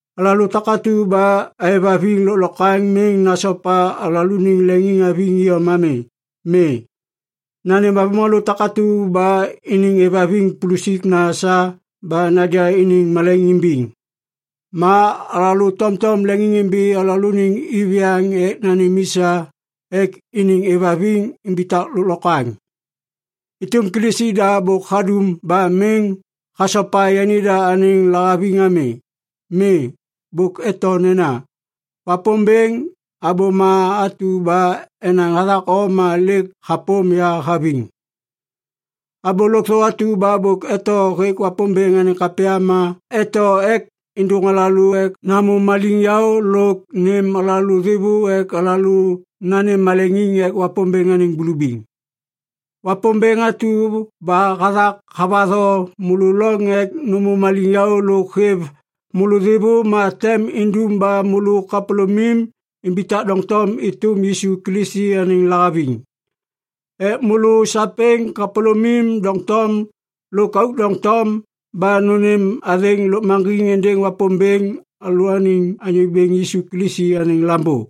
Alalô takatu ba aêvhaviŋ lôklokwaŋ miŋ nasopa alalôaniŋ leŋiŋhaviŋ iyom ami. Mi, nanêm avômalô takatu ba iniŋ êvhaviŋ pulusikna sa ba naja iniŋ malaiŋ imbiŋ. Ma alalô tomtom leŋiŋimbi alalôaniŋ iviyaŋ ek nanêm i sa ek iniŋ êvhaviŋ imbitak lôklokwaŋ. Êtôm Kilisi da bôk hadum ba miŋ hasopa yanida anêŋ lahaviŋ ami. Mi, bôk eto nena, “Wapômbêŋ, abôma atu ba enaŋ hathak o ma lêk hapôm ya haviŋ.” Abô lôkthô atu ba bôk eto hêk Wapômbêŋ anêŋ kapya ma eto ek êndôŋ alalô ek namô maliŋyaô lôk nêm alalô thêvô ek alalô nanêm maleŋiŋ ek Wapômbêŋ anêŋ bulubiŋ. Wapômbêŋ atu ba hathak havatho môlô loŋ ek nômô maliŋyaô lôk hêv môlô thêvô ma tem indum ba môlô kapôlômim imbitak doŋtom êtôm Yisu Kilisi anêŋ lahaviŋ. Ek môlô sapêŋ kapôlômim doŋtom lôk auk doŋtom ba nônêm athêŋ lôkmaŋgiŋ êndêŋ Wapômbêŋ alalôaniŋ Anyô Bêŋ Yisu Kilisi anêŋ Lambô.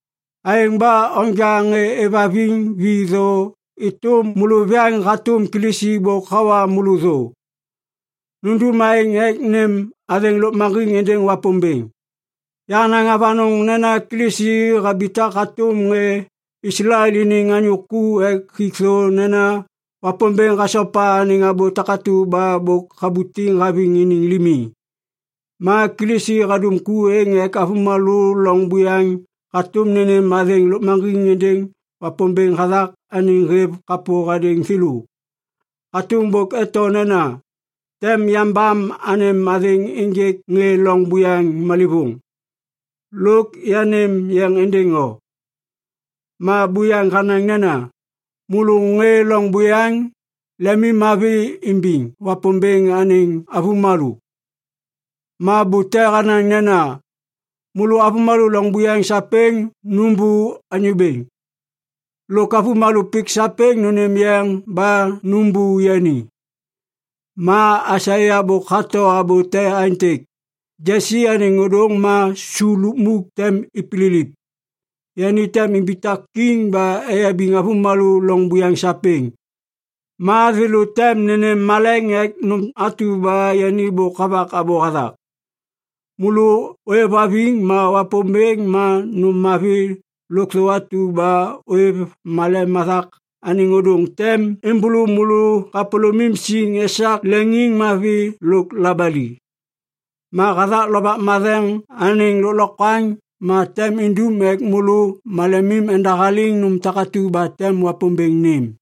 Aêŋ ba onja ŋê êvhaviŋ vi thô êtôm môlôviyaŋ hatôm Kilisi bôk hawa môlô thô. Nundum aêŋ ek nêm athêŋ lôkmaŋgiŋ êndêŋ Wapômbêŋ. Yahanaŋ avanôŋ nena Kilisi habitak hatôm ŋê Islael iniŋ anyô ku ek hik thô nena Wapômbêŋ hasopa anêŋ abô takatu ba bôk habutiŋ haviŋ iniŋ limi. Ma Kilisi hadum ku êŋ ek avômalô loŋ buyaŋ hatôm nênêm athêŋ lôkmaŋgiŋ êndêŋ Wapômbêŋ hathak anêŋ hêv kapô hadêŋ thêlô. Hatôm bôk eto nena, “Tem yambam anêm athêŋ ênjêk ŋê loŋ buyaŋ malêvôŋ. Lôk yanêm yeŋ êndêŋ o.” Ma buyaŋ hanaŋ nena, “Môlô ŋê loŋ buyaŋ, lemimmavi imbiŋ Wapômbêŋ anêŋ avômalô.” Ma bute hanaŋ nena, “Môlô avômalô loŋ buyaŋ sapêŋ nômbô Anyô Bêŋ. Lôk avômalô pik sapêŋ nônêm yeŋ ba nômbô yani.” Ma Aisaia bôk hato abô te aêntêk, “Jesi anêŋ ôdôŋ ma su lukmuk tem ipililip. Yani tem imbitak kiŋ ba eyabiŋ avômalô loŋ buyaŋ sapêŋ. Ma thêlô tem nênêm maleŋ ek nôm atu ba yani bôk havak abô hathak.” Môlô ôêvhaviŋ ma Wapômbêŋ ma nôm mavi lôkthô atu ba ôêv malem hathak anêŋ ôdôŋ tem êmbôlô môlô kapôlômim siŋ esak leŋiŋmavi lôk labali. Ma hathak Lovak Matheŋ anêŋ lôklokwaŋ ma tem indum ek môlô malemim endahaliŋ nôm takatu ba tem Wapômbêŋ nêm.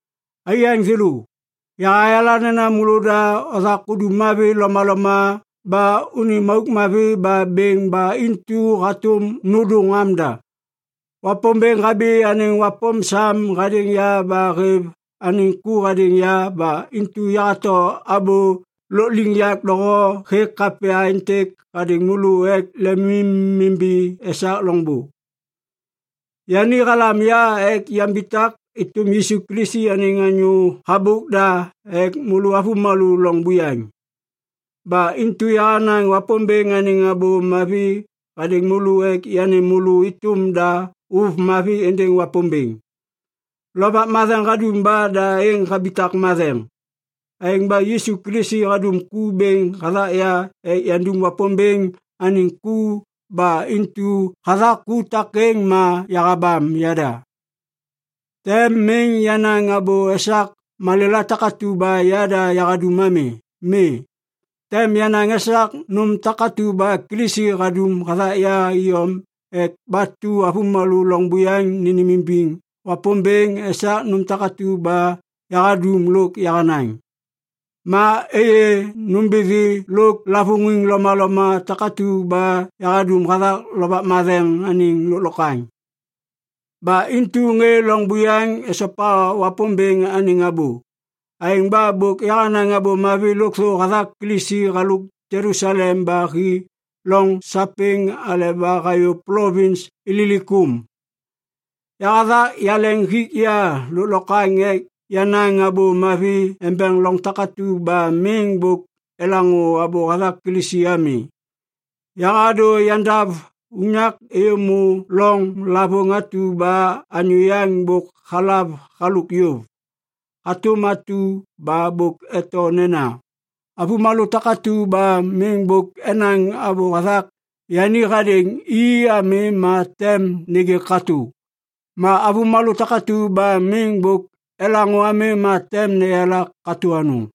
Aiyaŋ thêlô, yahayala nena môlôda othak udum mavi lomaloma ba unim auk mavi ma bêŋ ba intu hatôm nôndôŋ amda. Wapômbêŋ habi anêŋ wapôm sam hadêŋ ya ba hêv anêŋ ku hadêŋ ya ba intu yahato abô lôkliŋyak doho hêk kapya êntêk hadêŋ môlô ek lemimimbi esak loŋbô. Yani halam ya ek yambitak êtôm Yisu Kilisi anêŋ anyô habôk da ek môlô avômalô loŋ buyaŋ. Ba intu yahanaŋ Wapômbêŋ anêŋ Abô Mavi hadêŋ môlô ek yanêm môlô êtôm da ôv mavi êndêŋ Wapômbêŋ. Lovak Matheŋ hadum ba da êŋ habitak matheŋ. Aêŋ ba Yisu Kilisi hadum ku bêŋ hathak ya ek yandum Wapômbêŋ anêŋ ku ba intu hathak ku takêŋ ma yahabam yada. Tem miŋ yanaŋ abô esak malêla takatu ba yada yahadum ami. Mi, tem yanaŋ esak nôm takatu ba Kilisi hadum hathak ya iyom ek batu avômalô loŋ buyaŋ nênêmimbiŋ Wapômbêŋ esak nôm takatu ba yahadum lôk yahanaŋ. Ma êyê nômbithi lôk lavôŋiŋ lomaloma takatu ba yahadum hathak Lovak Matheŋ anêŋ lôklokwaŋ. Ba intu ŋê loŋ buyaŋ esopa Wapômbêŋ anêŋ abô. Aêŋ ba bôk yahanaŋ Abô Mavi lôkthô hathak Kilisi halôk Jelusalem ba hi loŋ sapêŋ aleba hayô plovins Ililikum. Yahathak yaleŋ hik ya lôklokwaŋ ek yanaŋ Abô Mavi embeŋ loŋ takatu ba miŋ bôk elaŋô abô hathak Kilisi ami. Yahadô yandav unyak êyômô loŋ lavôŋ atu ba anyô yaŋ bôk halav halôk yôv. Hatôm atu ba bôk eto nena, “Avômalô takatu ba miŋ bôk enaŋ abô hathak yani hadêŋ i ami ma tem nêgê katô. Ma avômalô takatu ba miŋ bôk elaŋô ami ma tem neyala katô anôŋ.”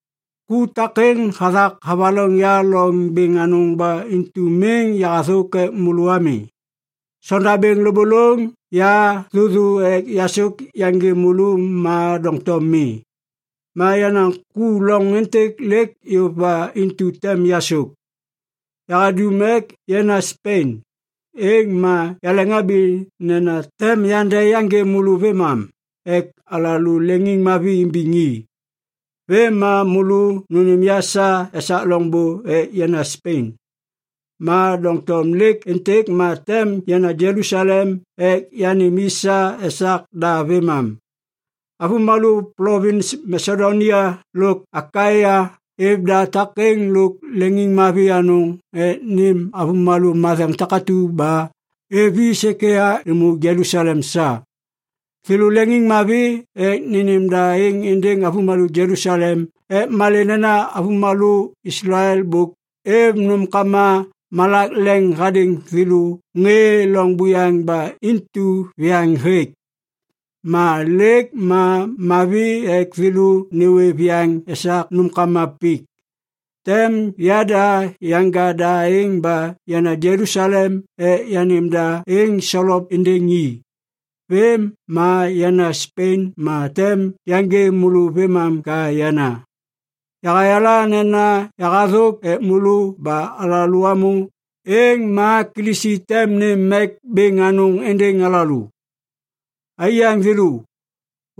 Ku takêŋ hathak havaloŋ ya loŋ bêŋ anôŋ ba intu miŋ yahathôk ek môlô ami. Sondabêŋ lôbôlôŋ ya thôthô ek yasôk yaŋgê môlô ma doŋtom mi. Ma yenaŋ ku loŋ êntêk lêk yôv ba intu tem yasôk. Yahadum ek yana Spen, êŋ ma yaleŋhabi nena tem yande yaŋgê môlô vêmam ek alalô leŋiŋmavi imbiŋ i. Vêm ma môlô nônêm ya sa esak loŋôndê ek yana Spen. Ma doŋtom lêk êntêk ma tem yana Jelusalem ek yanêm i sa esak da vêmam. Avômalô plovins Masedonia lôk Akaia êv da takêŋ lôk leŋiŋmavi anôŋ ek nênêm avômalô matheŋ takatu ba êv i sêkêya êmô Jelusalem sa. Thêlô leŋiŋmavi ek nênêm da êŋ êndêŋ avômalô Jelusalem ek malê nena avômalô Islael bôk êv nômkama malak leŋ hadêŋ thêlô ŋê loŋ buyaŋ ba intu viyaŋ hêk. Ma lêk ma mavi ek thêlô nêwê viyaŋ esak nômkama pik. Tem yada yanja da êŋ ba yana Jelusalem ek yanêm da êŋ solop êndêŋ i. Vêm ma yana Spen ma tem yaŋgê môlô vêmam ka yana. Yahayala nena yahathôk ek môlô ba alalô amô, êŋ ma Kilisi tem nêm mek bêŋ anôŋ êndêŋ alalô. Aiyaŋ thêlô,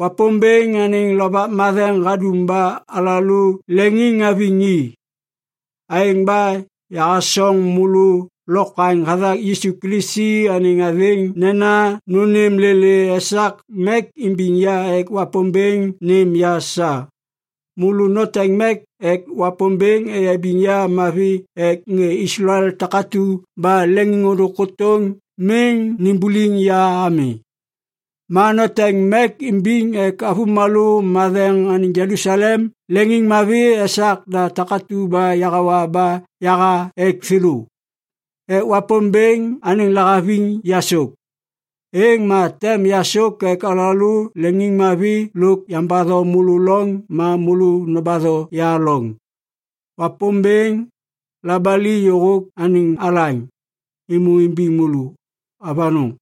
Wapômbêŋ anêŋ Lovak Matheŋ hadum ba alalô leŋiŋhaviŋ i. Aêŋ ba yahasoŋ môlô lokwaŋ hathak Yisu Kilisi anêŋ athêŋ nena nônêm lêlê esak mek imbiŋ ya ek Wapômbêŋ nêm ya sa. Môlô noteŋ mek ek Wapômbêŋ eyabiŋ ya mavi ek ŋê Islael takatu ba leŋiŋôndôŋ kôtôŋ miŋ nimbuliŋ ya ami. Ma noteŋ mek imbiŋ ek avômalô matheŋ anêŋ Jelusalem leŋiŋmavi esak da takatu ba yahawa ba yaha ek thêlô. Ek Wapômbêŋ anêŋ lahaviŋ yasôk, êŋ ma tem yasôk ek alalô leŋiŋmavi lôk yambatho môlô loŋ ma môlô nobatho ya loŋ. Wapômbêŋ, labali lôkthô anêŋ alaŋ, êmô imbiŋ môlô. Avanôŋ.